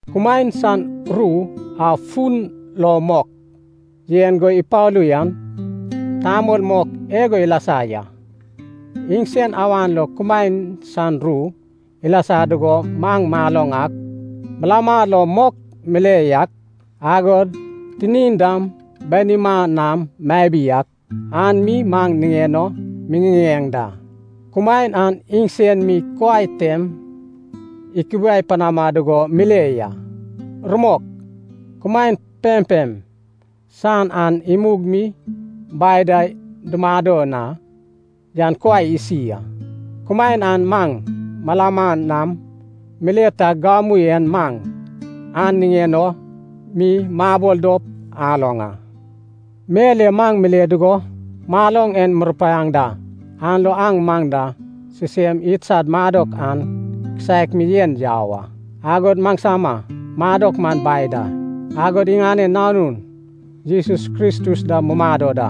Kumaen san ru a fun lo mok yen go ipalu yan, tamol mok igo ilasa ya. Iŋsen awan lo kumaen san ru ilasa dugo maŋ maloŋ ak, malama lo mok mile yak, agod tinin dam banima nam mabi ak, an mi maŋ niŋen o miŋiŋeŋ da. Kumaen an iŋsen mi kuai tem ikubiai panama dugo mile ya. Rumok, kumaen pempem san an imug mi Bai da dumado na yan kuai isi a. Kumaen an maŋ malama nam mile tag gamu en maŋ an niŋen o mi mabol dop aloŋ a. Mel e maŋ mile dugo maloŋ en murupaiaŋ da. An lo aŋ maŋ da sisem idsad madok an kisaek mi yen yau a. Agod maŋsama madok man Bai da, agod iŋanen Nanun Jesus Kristus da mumado da.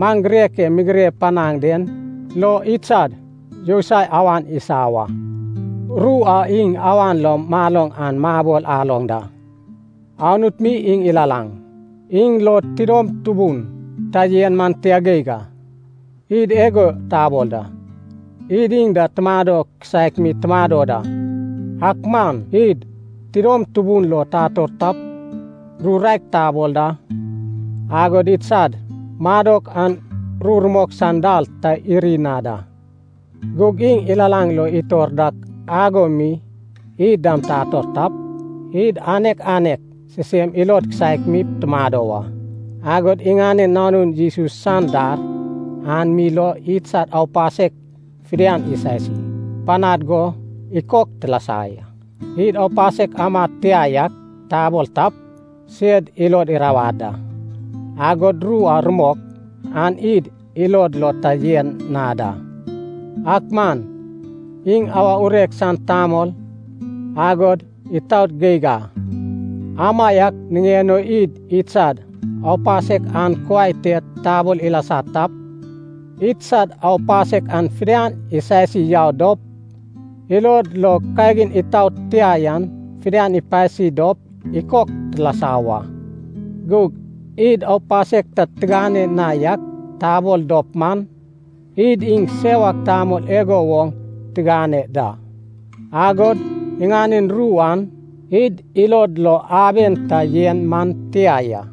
Maŋ girek e migire panaŋ den lo idsad yousai awan isa wa. Ru a iŋ awan lo maloŋ an mabol aloŋ da. Anut mi iŋ ilalaŋ. Iŋ lo tidom tubun ta yen man tia geig a. Id igo tabol da, id iŋ da madok kisaek mi tumado da, ak man id tidom tubun lo tator tap, ru raek tabol da, agod idsad madok an ru rumok san dal ta iri na da. Gug iŋ ilalaŋ lo itor dak ago mi id dam tator tap, id anek anek sisem ilod kisaek mi tumado wa. Agod iŋanen Nanun Jesus san dar an mi lo idsad aupasek fidian isasi panad go ikok tilasa ya. Id aupasek amad tia yak tabol tap, sed ilod irawad da, agod ru a rumok an id ilod lo ta yen na da. Ak man iŋ awa urek san tamol, agod itaot geig a, amaiak niŋen o id idsad aupasek an kuai te tabol ilasa tap, idsad aupasek an fidian isasi yau dop, ilod lo kagin itaot tia yan fidian ipasi dop ikok tilasa wa. Gug id aupasek ta tigane na yak tabol dop man, id iŋ sewak tamol igo woŋ tigane da, agod iŋanen ru an id ilod lo aben ta yen man tia ya.